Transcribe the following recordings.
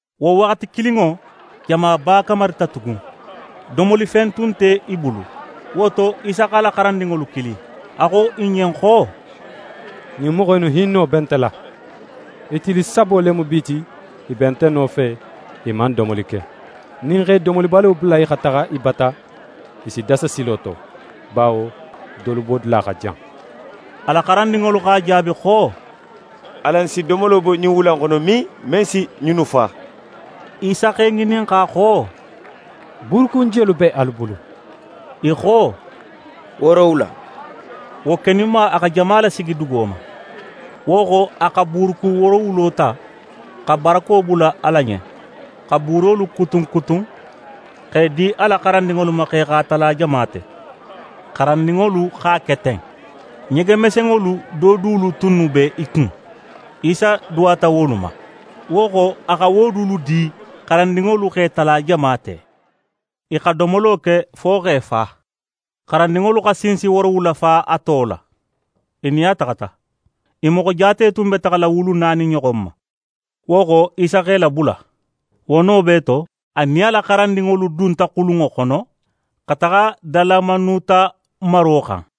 Wo waxati kilinŋo, jamaba kamarita tugun. Domolifen tun nte i bulu. Wo to, Isa x'a la xarandinŋolu kili, a xo i ɲen xo: «Ɲin moxo innu hinno be nte la. I tili sabo le mu bi ti, i be nte nofe, i man domoli ke. Nin ń x'e domolibalo bula i xa taxa i bata, i si dasa silo to, bawo dolu bodula xa jan.» A la xarandinŋolu x'a jaabi xo: «Alan si domolo bo min ɲin wula in xono, men si ɲinnu fa?» Isa x'e ŋininxa xo: «Buurukun jelu be alu bulu?» I xo: «Woorowula.» Wo keninma, a xa jama lasigi dugo ma. Wo xo, a xa buurukun woorowulo ta, xa barako bula Ala ɲen, xa buurolu kutun kutun, x'e di a la xarandinŋolu ma, x'e xa i tala jama te. Xarandinŋolu x'a ke ten. Ɲege mesenŋolu do dulu tunnu b'e kun; Isa duwata wolu ma, wo xo, a xa wo dulu di, xarandinŋolu x'e tala jama te. I xa domolo ke fo x'e fa. Xarandinŋolu xa sinsi woorowula fa a to la, i nin a xa taxa. I moxo jaate tun be taxala wulu naani ɲoxon ma. Wo xo, Isa x'e labula. Wo no bee to, a nin a la xarandinŋolu dunta xulunŋo xono, xa taxa Dalamanuta maro xan.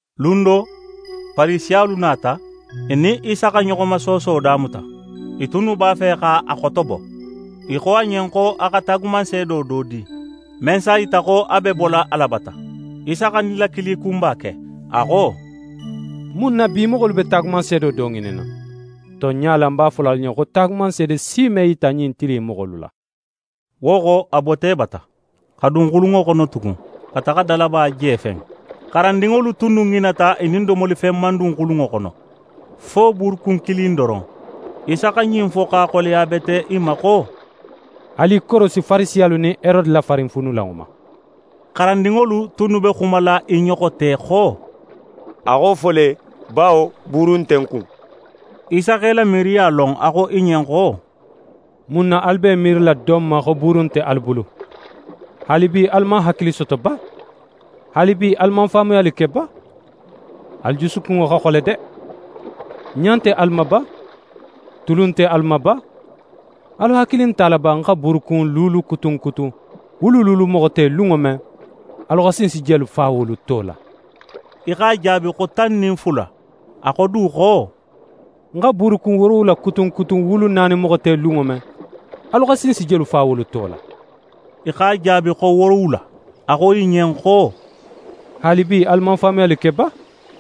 Lun do, Farisiyalu nata, i nin Isa xa ɲoxomasooso damuta. I tunnu b'a fe x'a xotobo. I xo a ɲen xo a xa taagumanseedo do di, men s'a yita xo a be bola Ala bata. Isa xa nilakili kunba ke, a xo: «Mun na bi moxolu be taagumanseedo do ŋininna? Tonɲa la, ń b'a fola alu ɲen xo taagumanseede si me yita ɲin tili in moxolu la.» Wo xo, a bota i bata, xa dun xulunŋo xono tugun, xa taxa dalaba jefen. xarandinŋolu tunnu ŋinata i nin domolifen man dun xulunŋo xono, fo buurukun kilin doron. Isa xa ɲin fo x'a xoleya bete i ma xo: «Alu i korosi Farisiyalu nin Herode la farinfuunulanŋo ma.» Xarandinŋolu tunnu be xumala i ɲoxo te xo: «A xa wo fo le, bawo buuru nte n kun.» Isa x'e la miiriya lon, a xo i ɲen xo: «Mun na alu be i miirila don ma xo buuru nte alu bulu? Haalibi, alu man hakili soto ba? Haalibi, alu man faamuyali ke ba? Alu jusukunŋo xa xole de! Ɲa nte alu ma ba? Tulu nte alu ma ba? Alu hakili nte a la ba, ń xa buurukun luulu kutun kutun wulu luulu moxo te lunŋo men, alu xa sinsi jelu fa wolu to la?» I x'a jaabi xo tan nin fula. A xo du xo: «Ń xa buurukun woorowula kutun kutun wulu naani moxo te lunŋo men, alu xa sinsi jelu fa wolu to la?» I x'a jaabi xo woorowula. A xo i ɲen xo: «Haalibi, alu man faamuyali ke ba?»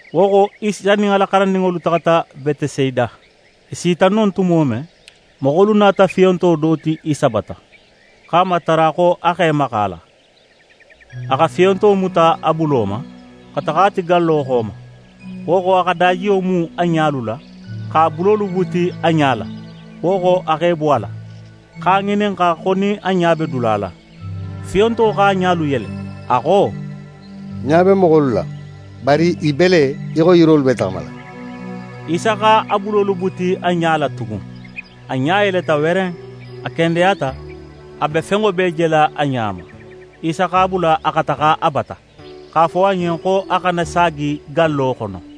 Wo xo, Isa nin a la xarandinŋolu taxata Betesayida; i sita non tumo men, moxolu nata fiyonto do ti Isa bata, x'a matara xo a x'é maxa a la. A xa fiyonto muta a bulo ma, xa taxa a ti gallo xo ma. Wo xo, a xa dajiyo mu a ɲalu la, x'a bulolu buti a ɲa la. Wo xo, a x'e bo a la, x'a ŋininxa xo nin a ɲa be dula la. Fiyonto x'a ɲalu yele, a xo: «Ń ɲa be moxolu la, bari i be le í xo yirolu b'e taxamala.» Isa x'a bulolu buti a ɲa la tugun; a ɲa yeleta weren. A kendeyata; a be fenŋo bee jela a ɲa ma. Isa x'a bula, a xa taxa a bata, x'a fo a ɲen xo a xana saagi gallo xono.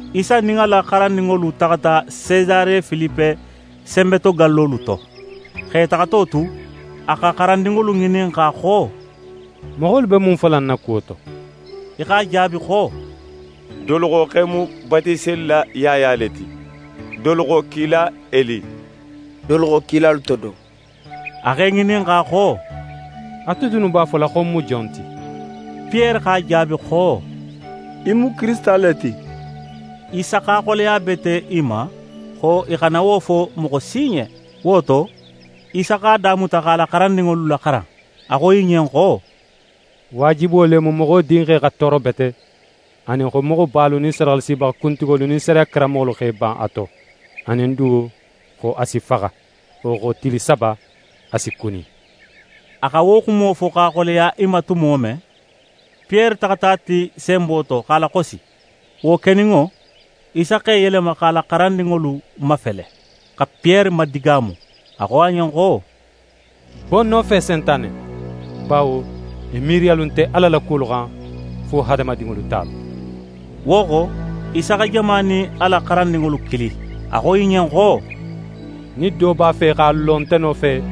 Isa nin a la xarandinŋolu taxata Sesare Filipe senbetogallolu to. X'e taxato tu, a xa xarandinŋolu ŋininxa xo: «Moxolu be mun fola ń na kuwo to?» I x'a jaabi xo: «Dolu xo x'é mu Batiselila Yaya le ti, dolu xo kila Eli, dolu xo kilalu to do.» A x'e ŋininxa xo: «Ate dunnu b'a fola xo ń mu jon ti?» Piyere x'a jaabi xo: «Í mu Kirisita le ti.» Isa x'a xoleya bete i ma xo i xana wo fo moxo si ɲen. Wo to, Isa x'a damuta x'a la xarandinŋolu laxaran. A xo i ɲen xo: «Waajibo le mu Moxo Dinxe xa tooro bete, anin xo moxobalu nin sadaxalasibaxa kuntigolu nin sariya karanmoxolu x'e ban a to. Anin du, xo a si faxa. Wo xo, tili saba, a si kuni.» A xa wo xumo fo x'a laxoyiya i ma tumo men, Piyere taxata a ti senbo to, x'a laxosi. Wo keninŋo, Isa x'é yelema x'a la xarandinŋolu mafele, xa Piyere madigaamu. A xo a ɲen xo: «Bo ń nofe, Sentane! Bawo í miiriyalu nte Ala la kuwolu xan, fo hadamadinŋolu talu.» Wo xo, Isa xa jama nin a la xarandinŋolu kili. A xo i ɲen xo: «Nin do b'a fe x'a lo nte nofe,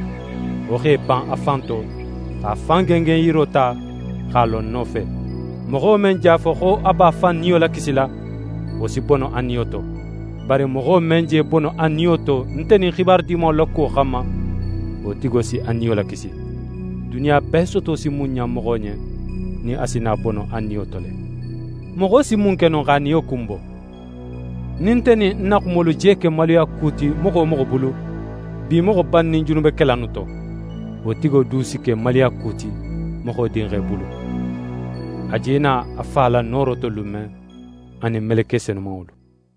wo x'é ban a fan to, x'a fan gengenyiro ta, x'a lo ń nofe. Moxo men je a fo, xo a b'a fan niyo lakisila, wo si bono a niyo to. Bari moxo men je bono a niyo to nte nin Xibaru Dimanŋo la kuwo xanma, wo tigo si a niyo lakisi. Duniya bee soto si mun ɲan moxo ɲen, nin a si na bono a niyo to le? Moxo si mun ke no x'a niyo kunbo? Nin nte nin ń na xumolu je ke maluyaku ti moxo wo moxo bulu, bi moxo bannin junubekelalu innu to, wo tigo du si ke maluyaku ti Moxo Dinxe bulu, a je na a Fa la nooro to lun men, a nin meleke senumanŋolu.»